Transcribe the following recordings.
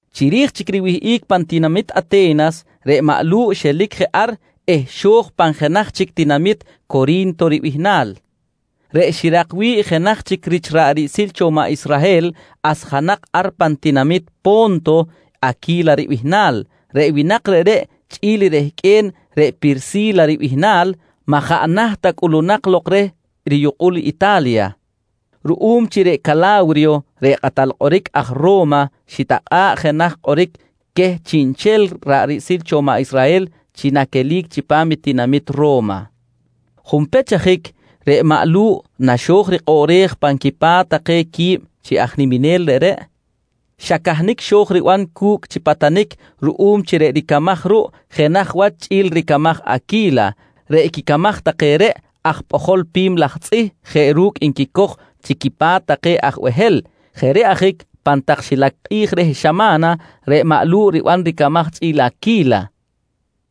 Chiri̱j chic riwihꞌic pan tinamit Ate̱nas, reꞌ maꞌ Lu̱ꞌ xelic je ar eh xo̱j pan jenaj chic tinamit Cori̱nto ribihnal reꞌ xirak wi̱ꞌ jenaj rich ra̱ꞌ riꞌsil cho maꞌ Israhel asjanak ar pan tinamit Po̱nto, Aqui̱la ribihnal. Reꞌ winak reꞌreꞌ chꞌi̱l i rehqꞌue̱n reꞌ Pirsi̱la ribihnal, maꞌ jaꞌ naht ta cꞌulunak lok reh riyukꞌul Ita̱lya ruꞌum chi reꞌ Cala̱wriyo reꞌ kꞌatal kꞌoric aj Ro̱ma xitakꞌa̱ꞌ jenaj kꞌoric queh chiꞌnchel ra̱ꞌ riꞌsil cho maꞌ Israhel chi naquelic chipam i tinamit Ro̱ma. Junpech ajic reꞌ maꞌ Lu̱ꞌ naxo̱j rikꞌoꞌrej pan quipa̱t take quib chi aj niminel reꞌreꞌ, xa cahnic xo̱j riban cu̱cꞌ chi patanic ruꞌum chi reꞌ ricamaj ruꞌ jenaj wach chꞌi̱l ricamaj i Aqui̱la. Reꞌ quicamaj take reꞌ, aj pꞌojol pi̱m laj tzꞌih jeꞌ ru̱cꞌ nquicoj chi quipa̱t take aj behel. Jeꞌ reꞌ ajic pan tak xilac kꞌi̱j reh xama̱na, reꞌ maꞌ Lu̱ꞌ riban ricamaj chꞌi̱l Aqui̱la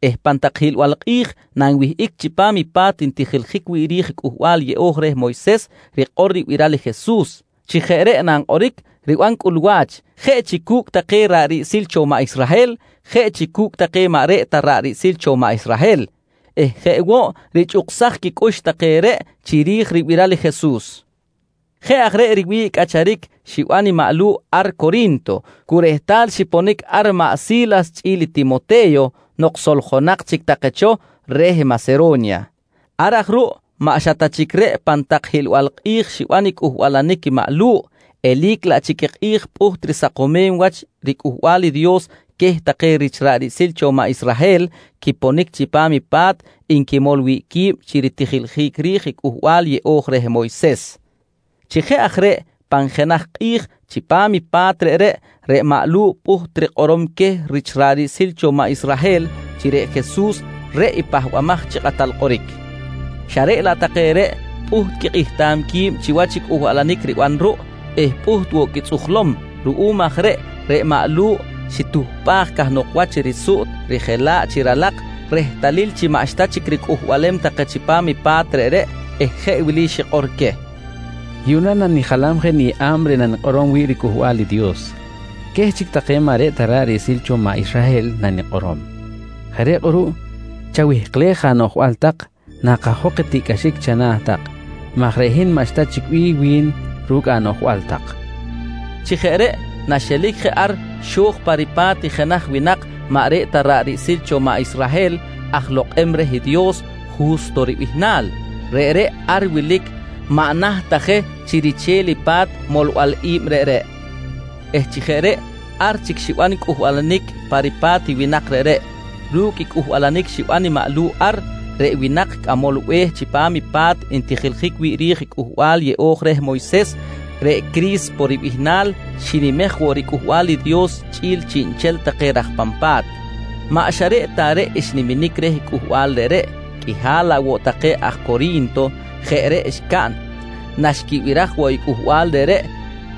eh pan tak hiꞌlbal kꞌi̱j nanwihꞌic chipam i pa̱t ntijiljic wi̱ꞌ ri̱j i Cꞌuhbal Yeꞌo̱j reh Moyses, rikꞌor ribiral i Jesus. Chi jeꞌ reꞌ nankꞌoric, riban cꞌulwa̱ch jeꞌ chi cu̱cꞌ take ra̱ꞌ riꞌsil cho maꞌ Israhel, jeꞌ chi cu̱cꞌ take maꞌ reꞌ ta ra̱ꞌ riꞌsil cho maꞌ Israhel eh jeꞌ woꞌ richꞌuksaj quicꞌux take reꞌ chiri̱j ribiral i Jesus. Jeꞌ aj reꞌ riwi̱ꞌ cꞌacharic xiban maꞌ Lu̱ꞌ ar Cori̱nto, cu rehtal xiponic ar i maꞌ Si̱las chꞌi̱l i Timote̱yo nok soljonak chic take cho reh Masero̱nya. Ar aj ruꞌ maꞌ xa ta chic reꞌ pan tak hiꞌlbal kꞌi̱j xiban cꞌuhbalanic i maꞌ Lu̱ꞌ, eli̱c laꞌ chic i kꞌi̱j pꞌuht risakomem wach riCꞌuhbal i Dios queh take rich ra̱ꞌ riꞌsil cho maꞌ Israhel quiponic chipam i pa̱t nquimol wi̱ꞌ qui̱b chi ritijiljic ri̱j i Cꞌuhbal Yeꞌo̱j reh Moyses. Chi jeꞌ aj reꞌ pan jenaj kꞌi̱j chipam i pa̱t reꞌreꞌ, reꞌ maꞌ Lu̱ꞌ pꞌuht rikꞌorom queh rich ra̱ꞌ riꞌsil cho maꞌ Israhel chi reꞌ Jesus reꞌ i Pahbamaj chi Kꞌatal Kꞌoric, xa reꞌ laꞌ take reꞌ, pꞌuht quikꞌihtam qui̱b chiwach i cꞌuhbalanic riban ruꞌ eh pꞌuht woꞌ quitzꞌujlom. Ruꞌum aj reꞌ, reꞌ maꞌ Lu̱ꞌ xituhpꞌaj cahnok wach risuꞌt rijela̱ꞌ chi ralak rehtalil chi maꞌxta chic ricꞌuhbalem take chipam i pa̱t reꞌreꞌ eh jeꞌ wili xikꞌor queh: «Yuꞌna nanijalam je niyeꞌa̱b reꞌ nanikꞌorom wi̱ꞌ riCꞌuhbal i Dios. Queh chic take maꞌ reꞌ ta ra̱ꞌ riꞌsil cho maꞌ Israhel nanikꞌorom. Jeꞌ reꞌ kꞌuruꞌ chawihklej anoꞌjbal tak nakajok i tiꞌcꞌaxic chana̱ tak maj reꞌ hin maꞌxta chic bih wi̱n ru̱cꞌ anoꞌjbal naꞌn tak, nqui maꞌ Lu̱ꞌ. Chi jeꞌ reꞌ naxelic je ar, xo̱j pa ripa̱t i jenaj winak maꞌ reꞌ ta ra̱ꞌ riꞌsil cho maꞌ Israhel aj lokꞌem reh Dios, Ju̱sto ribihnal. Reꞌreꞌ ar wilic maꞌ naht ta je chi riche̱l i pa̱t molbal i̱b reꞌreꞌ eh chi jeꞌ reꞌ, ar chic xiban cꞌuhbalanic pa ripa̱t i winak reꞌreꞌ. Ru̱cꞌ i cꞌuhbalanic xiban i maꞌ Lu̱ꞌ ar, reꞌ winak cꞌamol be̱h chipam i pa̱t ntijiljic wi̱ꞌ ri̱j Cꞌuhbal Yeꞌo̱j reh Moyses, reꞌ Cri̱spo ribihnal, xinimej woꞌ riCꞌuhbal i Dios chꞌi̱l chiꞌnchel take raj pan pa̱t. Maꞌ xa reꞌ ta reꞌ xniminic reh cꞌuhbal reꞌreꞌ, qꞌuihal laꞌ woꞌ take aj Cori̱nto jeꞌ reꞌ xcaꞌn naxquibiraj woꞌ i cꞌuhbal reꞌreꞌ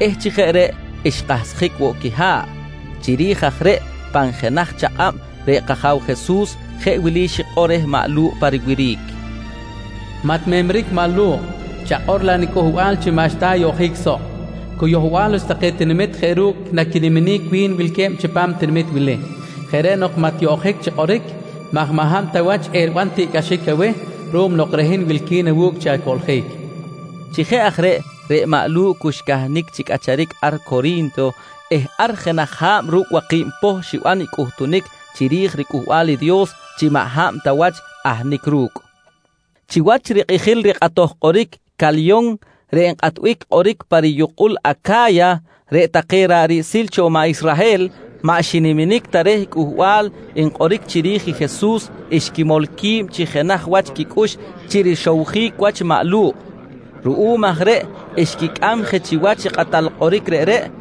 eh chi jeꞌ reꞌ xkahsjic woꞌ quiha̱ꞌ. Chiri̱j aj reꞌ pan jenaj chakꞌab reꞌ kAja̱w Jesus jeꞌ wili xikꞌor reh maꞌ Lu̱ꞌ pa riwiric: «Maꞌ timemric maꞌ Lu̱ꞌ, chakꞌor laꞌ niCꞌuhbal chi maꞌxta ayoꞌjic soꞌ. Cu yohbal wach take tinamit jeꞌ ru̱cꞌ naqui̱nquinimem wilque̱b chipam i tinamit wili. Jeꞌ reꞌ nok, maꞌ tiyoꞌjic chi kꞌoric maj maꞌ hab ta wach eriban tiꞌcꞌaxic aweh ruꞌum nok reꞌ hin wilqui̱n awu̱cꞌ chi acoꞌljic, nqui reh pa riwiric. Chi jeꞌ aj reꞌ, reꞌ maꞌ Lu̱ꞌ cu xcahnic chi cꞌacharic ar Cori̱nto eh ar jenaj ha̱b ru̱cꞌ waki̱b poh xiban i cꞌuhtunic chiri̱j riCꞌuhbal i Dios chi maꞌ hab ta wach ahnic ru̱cꞌ. Chiwach rikꞌijil rikꞌatoj kꞌoric i Calyon reꞌ nkꞌatbic kꞌoric pa riyukꞌul Aca̱ya, reꞌ take ra̱ꞌ riꞌsil cho maꞌ Israhel maꞌ xiniminic ta reh i cꞌuhbal nkꞌoric chiri̱j i Jesus xquimol qui̱b chi jenaj wach quicꞌux chi rixowjic wach maꞌ Lu̱ꞌ. Ruꞌum aj reꞌ xquicꞌam je chiwach i kꞌatal kꞌoric reꞌreꞌ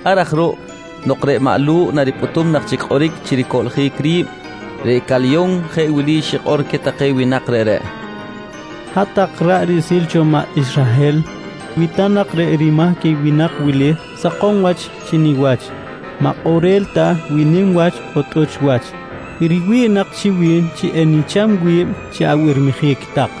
Ar aj ruꞌ nok reꞌ maꞌ Lu̱ꞌ naripꞌutum nak chic kꞌoric chi ricoꞌljic ri̱b, reꞌ Calyon jeꞌ wili xikꞌor queh take winak reꞌreꞌ: «Hat-tak ra̱ꞌ riꞌsil cho maꞌ Israhel, wi ta nak reꞌ rimahc i winak wili sakom wach chi niwach, maꞌ kꞌorel ta wi nim wach on tꞌuch wach, riwi̱ꞌ nak chi wi̱n chi enicham wi̱b chi abirmijic tak.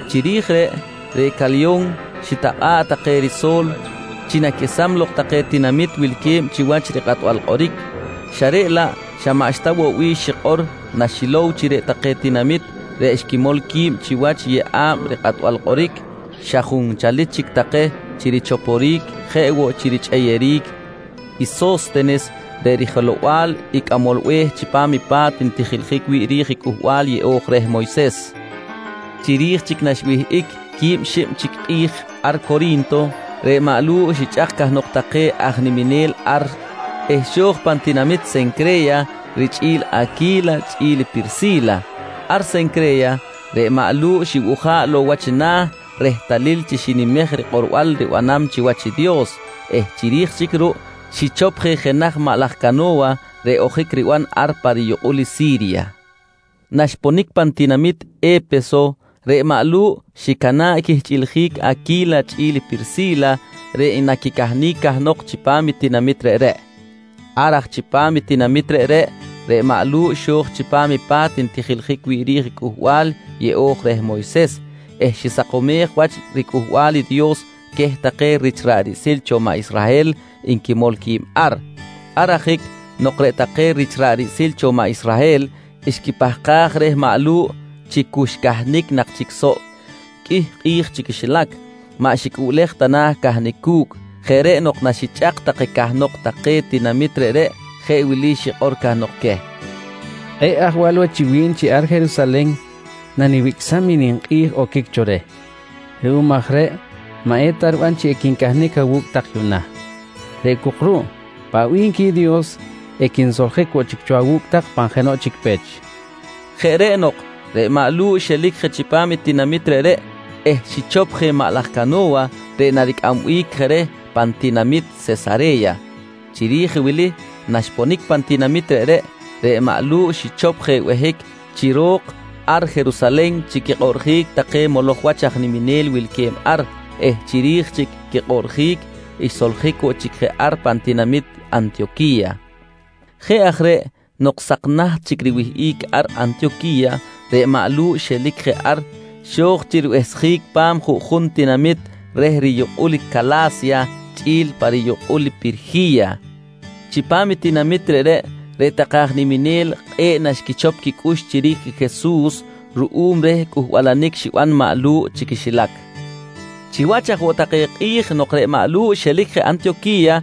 Chiri̱j reꞌ, reꞌ Calyon xitakꞌa̱ꞌ take riso̱l chi naquesam lok take tinamit wilque̱b chiwach rikꞌatbal kꞌoric xa reꞌ laꞌ xa maꞌxta woꞌ bih xikꞌor naxilow chi reꞌ take tinamit reꞌ xquimol qui̱b chiwach i yeꞌa̱b rikꞌatbal kꞌoric, xa junchalic chic take chi richoporic jeꞌ woꞌ chi richꞌeyeric i So̱stenes reꞌ rijelow-bal i cꞌamol be̱h chipam i pa̱t ntijiljic wi̱ꞌ ri̱j i Cꞌuhbal Yeꞌo̱j reh Moyses. Chiri̱j chic naxwihꞌic quib xib chic kꞌi̱j ar Cori̱nto, reꞌ maꞌ Lu̱ꞌ xichꞌak cahnok take aj niminel ar eh xo̱j pan tinamit Sencre̱ya richꞌi̱l Aqui̱la chꞌi̱l Pirsi̱la. Ar Sencre̱ya reꞌ maꞌ Lu̱ꞌ xibuja̱ꞌ lok wach na̱ rehtalil chi xinimej i rikꞌorbal ribanam chiwach Dios eh chiri̱j chic ruꞌ, xichop je jenaj maꞌ laj cano̱wa reꞌ ojic riban ar pa riyukꞌul i Si̱rya. Naxponic pan tinamit E̱peso, reꞌ maꞌ Lu̱ꞌ xicana̱ꞌ quihchꞌiljic Aqui̱la chꞌi̱l Pirsi̱la reꞌ naquicahnic cahnok chipam i tinamit reꞌreꞌ. Ar aj chipam i tinamit reꞌreꞌ, reꞌ maꞌ Lu̱ꞌ xo̱j chipam i pa̱t ntijiljic wi̱ꞌ ri̱j i Cꞌuhbal Yeꞌo̱j reh Moyses eh xisakomej wach riCꞌuhbal i Dios queh take rich ra̱ꞌ riꞌsil cho maꞌ Israhel nquimol qui̱b ar. Ar ajic nok reꞌ take rich ra̱ꞌ riꞌsil cho maꞌ Israhel xquipahkaj reh maꞌ Lu̱ꞌ chi cu xcahnic nak chic soꞌ qꞌuih kꞌi̱j chi quixilac, maꞌ xicꞌuꞌlej ta na̱ cahnic cu̱cꞌ. Jeꞌ reꞌ nok naxichꞌak take cahnok take tinamit reꞌreꞌ, jeꞌ wili xikꞌor cahnok queh: «Kꞌe̱ꞌ ajwal wach chi wi̱n chi ar Jerusalen nawicꞌsam i ninkꞌi̱j oquic cho reh. Ruꞌum aj reꞌ maꞌ eta riban chi equincahnic awu̱cꞌ tak yuꞌna. Reꞌ cok ruꞌ paꞌ bih nqui Dios, equinsoljic woꞌ chic cho awu̱cꞌ tak pan jenoꞌ chic pech, nqui cahnok queh. Jeꞌ reꞌ nok, reꞌ maꞌ Lu̱ꞌ xelic je chipam i tinamit reꞌreꞌ eh xichop je maꞌ laj cano̱wa reꞌ naricꞌambic je reh pan tinamit Sesare̱ya. Chiri̱j wili naxponic pan tinamit reꞌreꞌ, reꞌ maꞌ Lu̱ꞌ xichop je behic chi ro̱k ar Jerusalen chi quikꞌoꞌrjic take moloj wach aj niminel wilque̱b ar eh chiri̱j chic quikꞌoꞌrjic xsoljic woꞌ chic je ar pan tinamit Antiyoqui̱ya. Jeꞌ aj reꞌ, nok sak naht chic riwihꞌic ar Antiyoqui̱ya, reꞌ maꞌ Lu̱ꞌ xelic je ar xo̱j chi ribehsjic pa̱m juꞌjun tinamit reh riyukꞌul i Cala̱sya chꞌi̱l pa riyukꞌul i Pirji̱ya. Chipam i tinamit reꞌreꞌ, reꞌ take aj niminel kꞌe̱ꞌ naxquichop quicꞌux chiri̱j i Jesus ruꞌum reh cꞌuhbalanic xiban maꞌ Lu̱ꞌ chi quixilac. Chiwach aj woꞌ take kꞌi̱j nok reꞌ maꞌ Lu̱ꞌ xelic je Antiyoqui̱ya,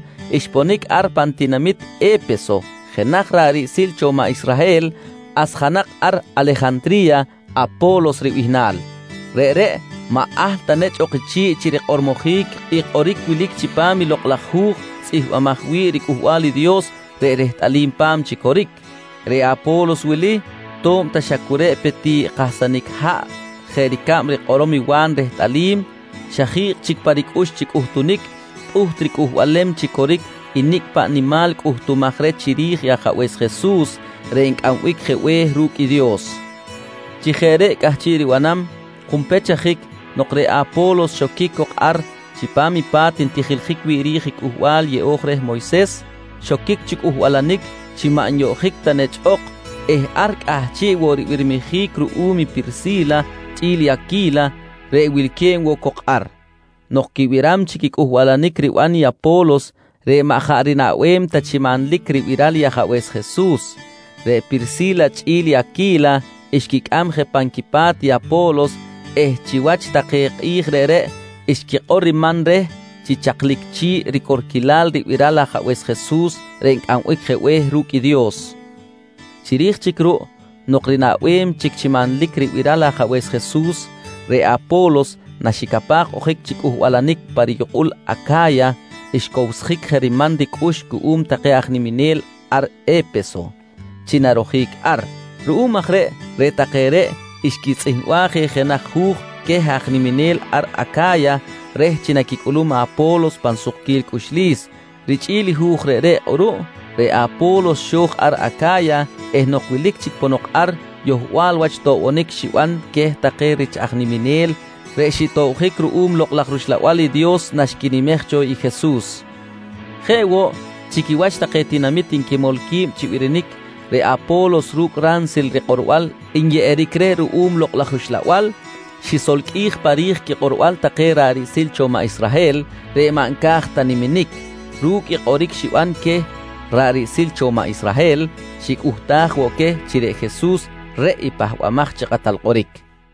xponic ar pan tinamit E̱peso jenaj ra̱ꞌ riꞌsil cho maꞌ Israhel asjanak ar Alejantri̱ya Apo̱los ribihnal. Reꞌreꞌ maꞌ ahl ta nechꞌ ok chi̱ꞌ chi rikꞌormojic i kꞌoric wilic chipam i Lokꞌ laj Hu̱j tzꞌihmbimaj wi̱ꞌ riCꞌuhbal i Dios reꞌ rehtꞌalim pa̱m chi coric. Reꞌ Apo̱los wili, to̱b ta xa cu reꞌ pe ti kahsanic haꞌ jeꞌ ricab rikꞌorom i Wa̱n rehtꞌalim, xa ji̱kꞌ chic pa ricꞌux chi cꞌuhtunic, pꞌuht ricꞌuhbalem chi coric i nicꞌ paꞌ nimal cꞌuhtumaj reh chiri̱j Ajabe̱s Jesus reꞌ Ncꞌambic je Be̱h ru̱cꞌ i Dios. Chi jeꞌ reꞌ cꞌahchiꞌ ribanam, junpech ajic nok reꞌ Apo̱los xoquic cok ar chipam i pa̱t ntijiljic wi̱ꞌ ri̱j Cꞌuhbal Yeꞌo̱j reh Moyses, xoquic chi cꞌuhbalanic chi maꞌ nyoꞌjic ta nechꞌ ok eh ar cꞌahchiꞌ woꞌ ribirmijic ruꞌum i Pirsi̱la chꞌi̱l i Aqui̱la reꞌ wilque̱b woꞌ cok ar. Nok quibiram chic i cꞌuhbalanic riban i Apo̱los reꞌ maꞌ jaꞌ rinaꞌbem ta chi manlic ribiral i Ajabe̱s Jesus, reꞌ Pirsi̱la chꞌi̱l i Aqui̱la xquicꞌam je pan quipa̱t i Apo̱los eh chiwach take kꞌi̱j reꞌreꞌ xquikꞌor riman reh chi chaklic chi̱ꞌ i ricorquilal ribiral Ajabe̱s Jesus reꞌ Ncꞌambic je Be̱h ru̱cꞌ i Dios. Chiri̱j chic ruꞌ, nok rinaꞌbem chic chi manlic ribiral Ajabe̱s Jesus, reꞌ Apo̱los na xicapaj ojic chi cꞌuhbalanic pa riyukꞌul Aca̱ya xcowsjic je riman ricꞌux cuꞌum take aj niminel ar E̱peso chi narojic ar. Ruꞌum aj reꞌ, reꞌ take reꞌ xquitzꞌihmbaj je jenaj hu̱j queh aj niminel ar Aca̱ya reh chi naquicꞌulum Apo̱los pan sukquil cꞌuxlis. Richꞌi̱l i hu̱j reꞌreꞌ kꞌuruꞌ, reꞌ Apo̱los xo̱j ar Aca̱ya eh nok wilic chic ponok ar, yohbal wach toꞌbonic xiban queh take rich aj niminel reꞌ xitobjic ruꞌum i Lokꞌ laj rUxlabal i Dios chi naxquinimej cho i Jesus. Jeꞌ woꞌ, chi quiwach take tinamit nquimol qui̱b chi birinic, reꞌ Apo̱los ru̱cꞌ ransil rikꞌorbal nyeꞌeric reh ruꞌum Lokꞌ laj Uxlabal xisolqꞌuij pa ri̱j quikꞌorbal take ra̱ꞌ riꞌsil cho maꞌ Israhel reꞌ maꞌ nca̱j ta niminic. Ru̱cꞌ i kꞌoric xiban queh ra̱ꞌ riꞌsil cho maꞌ Israhel, xicꞌuhtaj woꞌ queh chi reꞌ Jesus reꞌ i Pahbamaj chi Kꞌatal Kꞌoric.